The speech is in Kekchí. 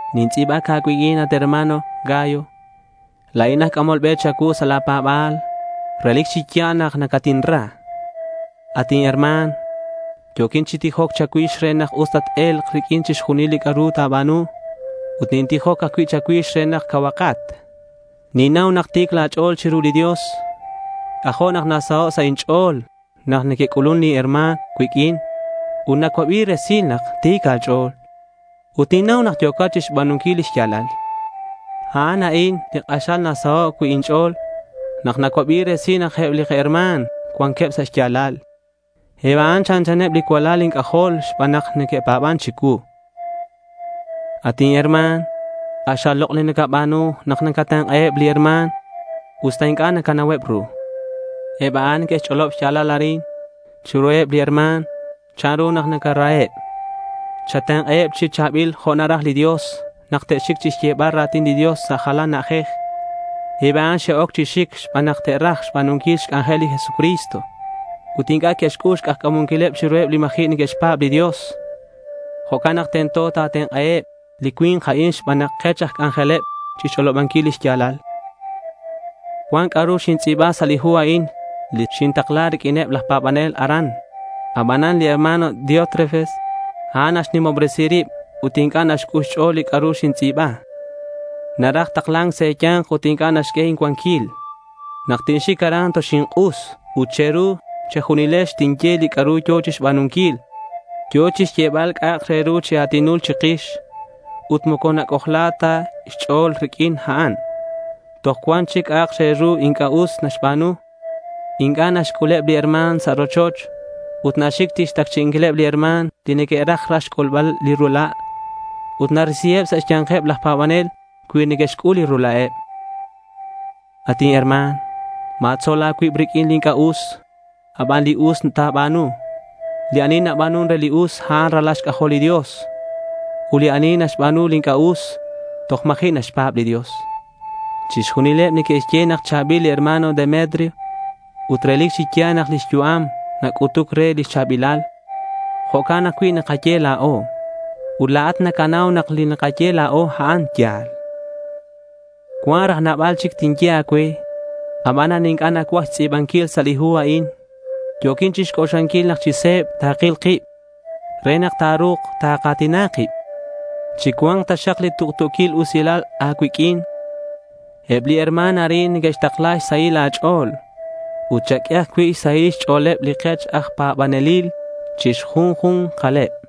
Nintz'i̱bac a̱cuiq'uin, at hermano Gayo. La̱in aj c'amol be cha̱cuu sa' la̱ pa̱ba̱l. Relic chi ya̱l nak nacatinra. At inherma̱n, yo̱quin chi tijoc cha̱cuix re nak us tat-e̱lk riq'uin chixjunil li c'a'ru ta̱ba̱nu. Ut nintijoc ajcui' cha̱cuix re nak cauhakat. Ninnau nak ti̱c la̱ ch'o̱l chiru li Dios. C'ajo' nak nasaho' sa' inch'o̱l nak neque'c'ulun li herma̱n cuiq'uin ut nacuabi resil nak ti̱c a̱ch'o̱l. Ut ninnau nak yo̱cat chixba̱nunquil li xya̱lal. A'an a'in li k'axal nasaho' cui' inch'o̱l nak nacuabi resil nak eb li kaherma̱n cuanqueb sa' xya̱lal. Eb a'an chanchaneb li cualal inc'ajol xban nak que'pa̱ban chicuu. At inherma̱n, k'axal lok' li nacaba̱nu nak nacatenk'aheb li herma̱n, usta inc'a' nacanauheb ru. Eb a'an que'xch'olob xya̱lal arin chiruheb li herma̱n chanru nak nacaraheb. Chatenk'aheb chi cha̱bil jo' naraj li Dios nak te'xic chixyebal ra̱tin li Dios sa' jalan na'ajej. Eb a'an xe'oc chi xic xban nak te'raj xba̱nunquil xc'anjel li Jesucristo. Ut inc'a' que'xc'ul xk'ajca̱munquileb chiruheb li ma̱ji' neque'xpa̱b li Dios. Jo'can nak tento takatenk'aheb li cui̱nk a'in xban nak kech aj c'anjeleb chixch'olobanquil li xya̱lal. Cuan c'a'ru xintz'i̱ba sa' li hu li xintakla riq'uineb laj pa̱banel aran. Abanan li herma̱n Diótrefes, a'an naxnimobresi rib ut inc'a' naxc'ul xch'o̱l li c'a'ru xintz'i̱ba. Naraj takla̱nc sa' e̱ya̱nk ut inc'a' naxq'ue incuanquil. Nak tinxic aran toxink'us ut che̱ru che̱junilex tinye li c'a'ru yo̱ chixba̱nunquil. Yo̱ chixyebal c'a'ak re ru chi a̱tinul chikix. Ut moco nac'ojla ta xch'o̱l riq'uin a'an. Toj cuan cui'chic c'a'ak re ru inc'a' us naxba̱nu. Inc'a' naxc'uleb li herma̱n sa' li rochoch ut naxic chixtacchi'inquileb li herma̱n li neque'raj raj xc'ulbal li ula', ut narisiheb sa' xya̱nkeb laj pa̱banel cui neque'xc'ul li rula'eb. At inherma̱n, ma̱tzol a̱cuib riq'uin li inc'a' us. A' ban li us ta̱ba̱nu. Li ani naba̱nun re li us, a'an ralal xc'ajol li Dios. Ut li ani naxba̱nu li inc'a' us, toj ma̱ji' naxpa̱b li Dios. Chixjunileb neque'xye nak cha̱bil li herma̱n Demetrio. Ut relic chi ya̱l nak lix yu'am nac'utuc re lix cha̱bilal. Jo'can ajcui' nakaye la̱o. Ut la̱at nacanau nak li nakaye la̱o a'an ya̱l. Cuan raj nabal chic tinye a̱cue, abanan inc'a' nacuaj xtz'i̱banquil sa' li hu a'in. Yo̱quin chixc'oxlanquil nak chi se̱b takil kib re nak ta̱ru̱k taka̱tina kib. Chicua̱nk taxak li tuktu̱quil usilal a̱cuiq'uin. Eb li herma̱n arin neque'xtakla xsahil a̱ch'o̱l. Ut chaq'ue ajcui' xsahil xch'o̱leb li kech aj pa̱banelil chi xjunju̱nkaleb.